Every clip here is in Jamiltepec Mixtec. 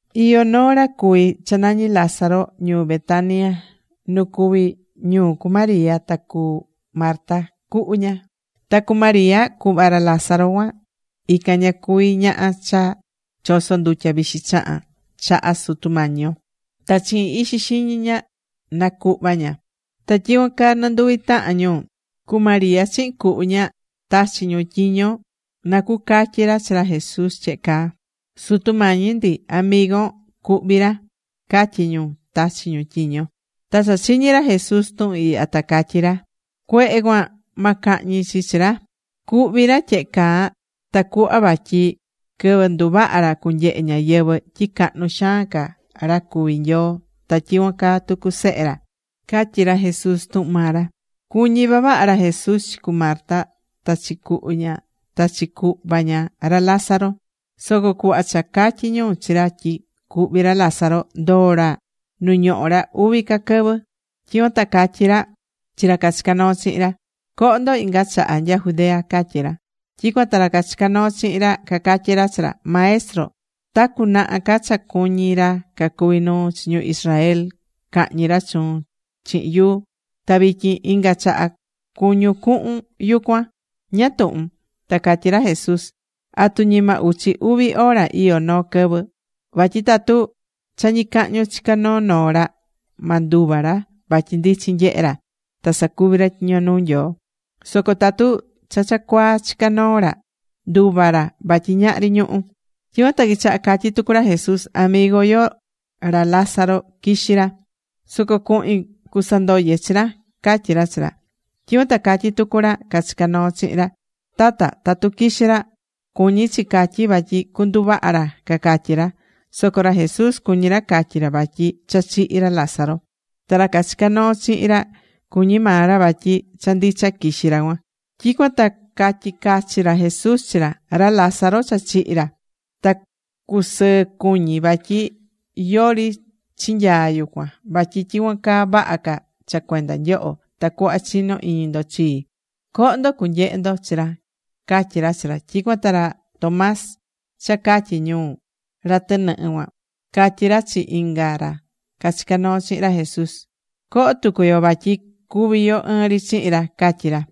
Iyó noo ra cuhví cha nañí Lázaro ñuu Betania nu cuví ñuu cu María ta cu Marta cuhu ña. Ta cu María, cuhva ra Lázaro cuan ican ña cuví ñaha cha choso̱ ndutya vixi chahán chaha Sutu Mañi yo, ta chihin ixi xiñi ña nacuhva̱ ña. Ta tyicuan caa nɨnduvi tahan ñu, cu María chihin cuhu ña, tachi̱ ñu tyiño na cucatyi ra chi ra Jesús tyehe caa; ―Sutu Mañi ndi, amigon cuhví ra ―catyí ñu, tachi̱ ñu tyiño. Ta cha chiñi̱ ra Jesús tuhun ihya ta catyí ra: ―Cuehe cuan ma cahñi chi chi ra. Cuhví ra tyehe caa tacuhva vatyi quɨvɨ nduvaha ra cunyehe ñáyɨvɨ tyi cahnu xaan ca ra cuví Nyoo ta tyicuan caa tucu Sehe ra ―catyí ra Jesús tuhun maa ra. Cuñí vavaha ra Jesús chi cu Marta ta chi cuhu ña, ta chi cuhva ña, ra Lázaro. Soco cuhva cha catyí ñu chi ra tyi cuhví ra Lázaro, ndoo̱ ra nu ñohó ra uvi ca quɨvɨ. Tyicuan ta catyí ra chi ra cachicá noo chihin ra: ―Coho ndo inga chaha nya Judea ―catyí ra. Tyicuan ta ra cachicá noo chihin ra cacatyí ra chi ra: ―Maestro, ta cunaha ca cha cuñí ra cacuví nuu chi ñu Israel cahñi ra chuun chihin yuu. Ta vityin, ¿inga chaha cuñún cuhun yucuan? ¿Ñáá tuhun? Ta catyí ra Jesús: ―¿Atu ñima uchi uvi hora iyó noo quɨvɨ? Vatyi tatu cha ñicahñu chicá noo noo ra, ma nduva ra vatyi ndichin nyehé ra ta sacuví ra tyiño nuu Nyoo. Soco tatu cha cha cuaa chicá noo ra, nduva ra vatyi ñahri ñuhu̱. Tyicuan ta quichaha catyí tucu ra Jesús: ―Amigo yo, ra Lázaro quixí ra. Soco cuhin cusandoye chi ra ―catyí ra chi ra. Tyicuan ta catyí tucu ra cachicá noo chihin ra: ―Tata, tatu quixí ra, cuñí chi catyí vatyi cuanduvaha ra ―cacatyí ra. Soco ra Jesús cuñí ra catyi ra vatyi cha chihi̱ ra Lázaro. Ta ra cachicá noo chihin ra, cuñí maa ra vatyi cha ndicha quixí ra cuan. Tyicuan ta catyi̱ cachi ra Jesús chi ra: ―Ra Lázaro cha chihi̱ ra. Ta cusɨɨ cuñí vatyi yori chinyaa̱ yucuan. Vatyi tyicuan caa vaha ca cha cuenda nyoho, tacuhva chino iñi ndo chii. Co̱ho ndo cunyehe ndo chi ra ―catyí ra chi ra. Tyicuan ta ra Tomás, cha catyí ñu: “ra tɨnɨhɨ cuan”, catyí ra chi inga ra cachicá noo chihin ra Jesús: ―Co̱ho tucu yo vatyi cúvi yo ɨɨn ri chihin ra ―catyí ra.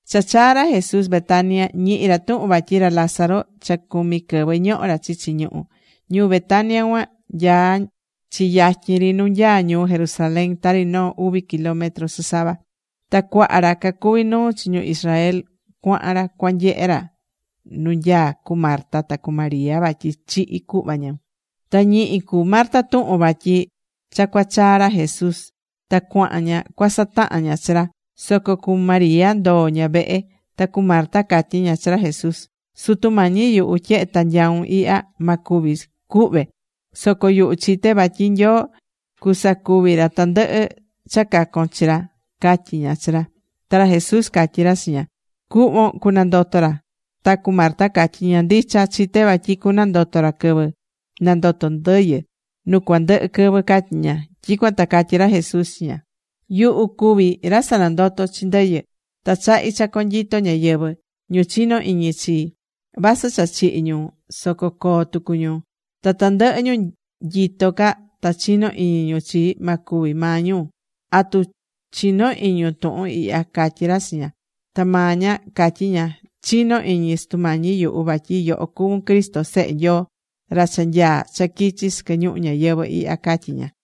Cha chaa̱ ra Jesús Betania, ñihi̱ ra tuhun vatyi ra Lázaro cha cumi quɨvɨ ñohó ra chichi ñuhú. Ñuu Betania cuan nyaá chi yatyin ri nu nyaá ñuu Jerusalén, tari noo uvi kilómetro sɨsava. Ta cuaha ra cacuví nuu chi ñu Israel cuahan ra cuanyehe ra nu nyaá cu Marta ta cu María vatyi chihi̱ cuhva ñu. Ta ñihi̱ cu Marta tuhun vatyi cha cuachaa ra Jesús. Ta cuahan ña cuasatahan ña chi ra. Soco cu María ndoo̱ ña vehe. Ta cu Marta catyí ña chi ra Jesús: ―Sutu mañí yuhu, tyehe ta nyau̱n ihya, ma cúvi cuhve. Soco yuhu chité vatyi Nyoo cusacuvi ra tandɨhɨ cha cacon chi ra ―catyí ña chi ra. Ta ra Jesús catyí ra chi ña: ―Cuhvon cunandoto ra. Ta cu Marta catyí ña: ―Ndicha, chité vatyi cunandoto ra quɨvɨ nandoto ndɨyɨ nu cuandɨhɨ quɨvɨ ―catyí ña. Tyicuan ta catyí ra Jesús chi ña: ―Yuhu cuví ra sanandotó chi ndɨyɨ. Ta chahí cha conyito ñáyɨvɨ. Ñu chinó iñi chii, vasɨ cha chihi̱ ñu soco coo tucu ñu. Ta tandɨhɨ ñu nyitó ca ta chinó iñi ñu chii, ma cúvi maa ñu. ¿Atu chiñó iñun tuhun ihya? ―catyí ra chi ña. Ta maa ña catyí ña: ―Chinó iñi, Sutu Mañi yuhu, vatyi yoho cuvún Cristo Sehe Nyoo, ra cha nyaá cha quichi sɨquɨ ñuhu ñayɨvɨ̱ ihya ―catyí ña.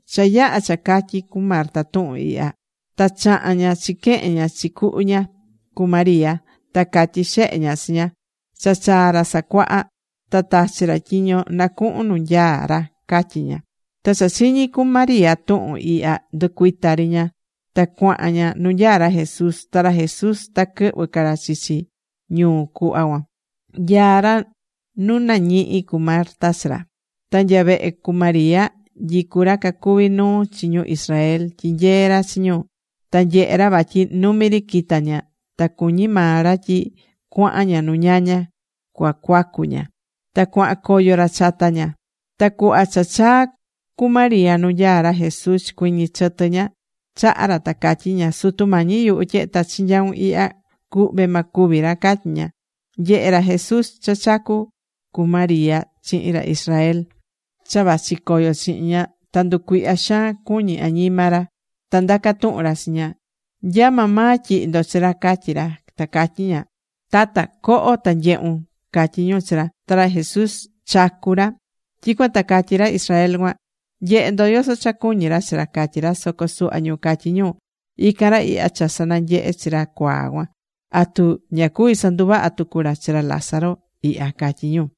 Cha yaha̱ cha catyi̱ cu Marta tuhun ihya, ta chaha̱n ña chiquehen ña chi cuhu ña, cu María, ta catyi̱ xehe ña chi ña: ―Cha chaa̱ Ra Sacuaha. Ta tachi̱ ra tyiño nacuhun nu nyaá ra ―catyí ña. Ta cha chiñi̱ cu María tuhun ihya, nducuita̱ ri ña, ta cuahan ña nu nyaá ra Jesús, Ta ra Jesús ta quɨhvɨ ca ra chichi ñuu cuhva cuan, nyaá ra nu nañihi̱ cu Marta chi ra. Ta nya vehe cu María, nyicú ra cacuví nuu chi ñu Israel tyinyeé ra chi ñu. Ta nyehe̱ ra vatyi numi ri quita̱ ña. Ta cuñí maa ra tyi cuahan ña nu ñaña cuacuacu ña. Ta cuahan coyo ra chata ña. Ta cuhva cha chaa̱ cu María nu nyaá ra Jesús chicuɨñɨ̱ chɨtɨ ña chaha ra, ta catyí ña: ―Sutu Mañi yuhu, tyehe ta chinyau̱n ihya, cuhve ma cúvi ra ―catyí ña. Nyehe̱ ra Jesús cha chacú cu María chihin ra Israel cha vachi coyo chihin ña, ta nducuihya xaan cuñí añima ra. Ta ndaca̱ tuhun ra chi ñu: ―¿Nya maa maa tyihi̱ ndo chi ra? ―catyí ra. Ta catyí ñu: ―Tata, co̱ho ta nye̱hun ―catyí ñu chi ra. Ta ra Jesús chacu̱ ra. Tyicuan ta catyí ra Israel cuan: ―Nye̱he ndo yoso cha cuñí ra chi ra ―catyí ra. Soco suhva ñu catyí ñu: ―Ican ra ihya cha sananyehe̱ chi ra cuaa cuan. ¿Atu ña cuví sanduvaha tucu ra chi ra Lázaro ihya? ―catyí ñu.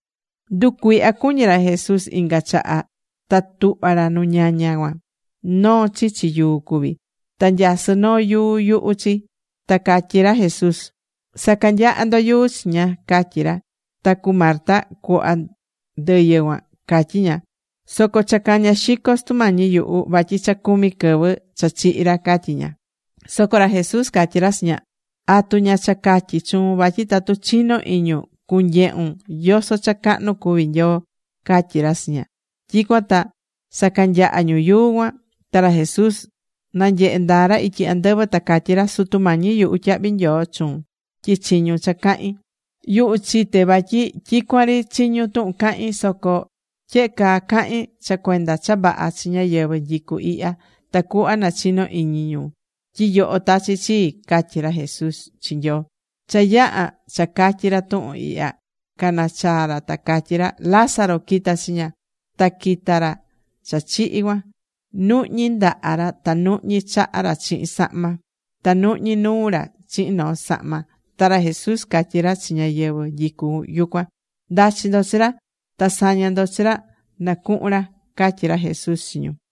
Nducuihya cuñí ra Jesús inga chaha ta tuhva̱ ra nu ñaña cuan. Noo chichi yuu cuví. Ta nyasɨ́ noo yuu yuhu chi. Ta catyí ra Jesús: ―Sa̱canyaha ndo yuu chiña ―catyí ra. Ta cu Marta, cuhva ndɨyɨ cuan, catyí ña: ―Soco cha caña̱ xico, Sutu Mañi yuhu, vatyi cha cumi quɨvɨ cha chihi̱ ra ―catyí ña. Soco ra Jesús catyí ra chi ña: ―¿Atu ña cha catyi̱ chuun vatyi tatu chinó iñun, cunyehun yoso cha cahnu cuví Nyoo? ―catyí ra chi ña. Tyicuan ta sacanyaha̱ ñu yuu cuan. Ta ra Jesús nanyehe̱ ndaa ra ityi andɨvɨ, ta catyí ra: ―Sutu Mañi yuhu, tyahvi nyoo chuun tyi chiñu̱n cha cahín. Yuhu chité vatyi tyicuan ri chiñún tuhun cahín. Soco tyehe caa cahín cha cuenda cha vaha chi ñáyɨvɨ nyicú ihya, tacuhva nachino iñi ñu tyi yoho tachi̱ chii ―catyí ra Jesús chi Nyoo. Cha yaha̱ cha catyi̱ ra tuhun ihya, canachaa̱ ra, ta catyí ra: ―¡Lázaro, qui̱ta chiña! Ta quita̱ ra cha chihi̱ cuan, nuhñí ndaha ra ta nuhñí chaha ra chihin sahma. Ta nuhñí nuu ra chihin noo sahma. Ta ra Jesús catyí ra chi ñáyɨvɨ nyicú yucuan: ―Nda̱chi ndo chi ra. Ta sa̱ña ndo chi ra nacuhun ra ―catyí ra Jesús chi ñu.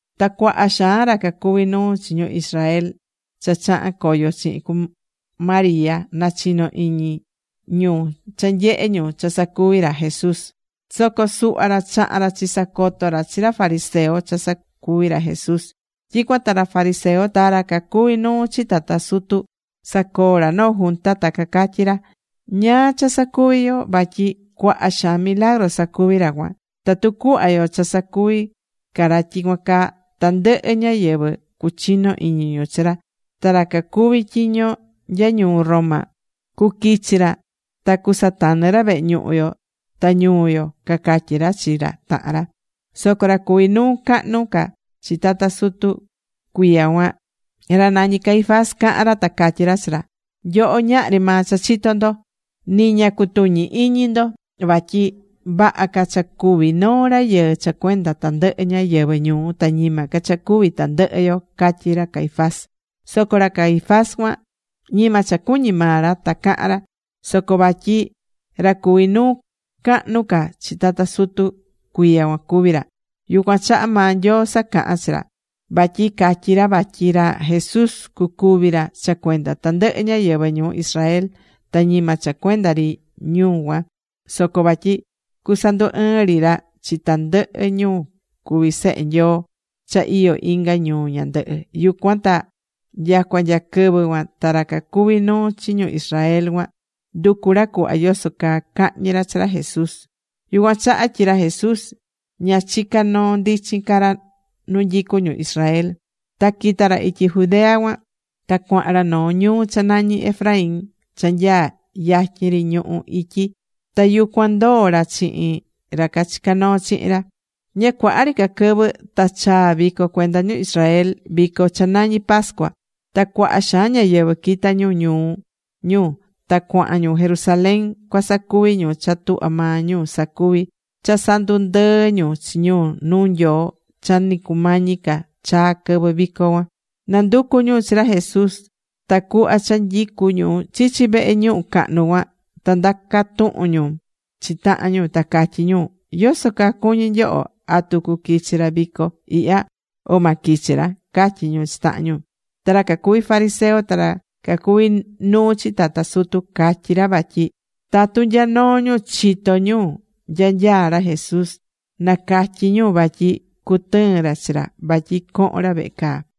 Ta cuaha xaan ra cacuví nuu chi ñu Israel cha chaha̱n coyo chihin cu María nachino iñi ñu cha nyehe̱ ñu cha sacuvi̱ ra Jesús. Soco suhva ra chaha̱n ra chisacoto ra chi ra fariseo cha sacuvi̱ ra Jesús. Tyicuan ta ra fariseo ta ra cacuví nuu chi tata sutu sacoo ra noo junta ta cacatyí ra: ―¿Ñáá cha sacuví yo? Vatyi cuaha xaan milagru sacuví ra cuan. Tatu cuhva yo cha sacuvi ca ra tyicuan caa, tandɨhɨ ñáyɨvɨ cuchino iñi ñu chi ra. Ta ra cacuví tyiño nya ñuu Roma cuquichi ra ta cusatanɨ ra vehe ñuhu yo ta ñuu yo ―cacatyí ra chi ra tahan ra. Soco ra cuví nuu cahnu ca chi tata sutu cuiya cuan, ra nañí Caifás caha̱n ra ta catyí ra chi ra: ―Nyoho ñahri maa cha chitó ndo. Ni ña cutuñí iñi ndo vatyi vaha ca cha cúvi noo ri rayɨɨ cha cuenda tandɨhɨ ñáyɨvɨ ñuu, ta ñima ca cha cúvi tandɨhɨ yo ―catyí ra Caifás. Soco ra Caifás cuan ñima cha cuñí maa ra ta cahán ra, soco vatyi ra cuví nuu cahnu ca chi tata sutu cuiya cuan cuví ra, yucuan chaha maa Nyoo sacaha̱n chi ra. Vatyi catyí ra vatyi ra Jesús cucúvi ra cha cuenda tandɨhɨ ñáyɨvɨ ñuu Israel. Ta ñima cha cuenda ri ñu cuan, soco vatyi cusandu ɨɨn ri ra chi tandɨhɨ ñu cuví sehe Nyoo cha iyó inga ñuu ñandɨhɨ. Yucuan ta nyacua nya quɨvɨ cuan ta ra cacuví nuu chi ñu Israel cuan, nducu ra cuhva yoso caa cahñi ra chi ra Jesús. Yucuan chaha tyi ra Jesús ña chicá noo ndichin ca ra nu nyicú ñu Israel. Ta quita̱ ra ityi Judea cuan. Ta cuahan ra noo ñuu cha nañí Efraín cha nyaá yatyin ri ñuhu ityi. Ta yucuan ndoó ra chihin ra cachicá noo chihin ra. Ña cuaha ri ca quɨvɨ ta chaa̱ vico cuenda ñu Israel, vico cha nañí pascua. Ta cuaha xaan ñáyɨvɨ quita̱ ñu ñuu ñu ta cuahan ñu Jerusalén cuasacuvi ñu cha tuhvá maa ñu sacuví cha sandundɨɨ́ ñu chi ñu nuu Nyoo cha ni cumañi ca chaa quɨvɨ vico cuan. Nanducú ñu chi ra Jesús. Ta cuhva cha nyicú ñu chichi vehe ñuhu cahnu cuan ta ndaca̱ tuhun ñu chi tahan ñu, ta catyí ñu: ―¿Yoso caa cuñí nyoho? ¿Atu cuquichi ra vico ihya, o ma quichi ra? ―catyí ñu chi tahan ñu. Ta ra cacuví fariseo ta ra cacuví nuu chi tata sutu, catyí ra vatyi tatu nya noo ñu chitó ñu nya nyaá ra Jesús, nacatyi ñu. Vatyi cutɨɨn ra chi ra vatyi cohon ra vehe caa.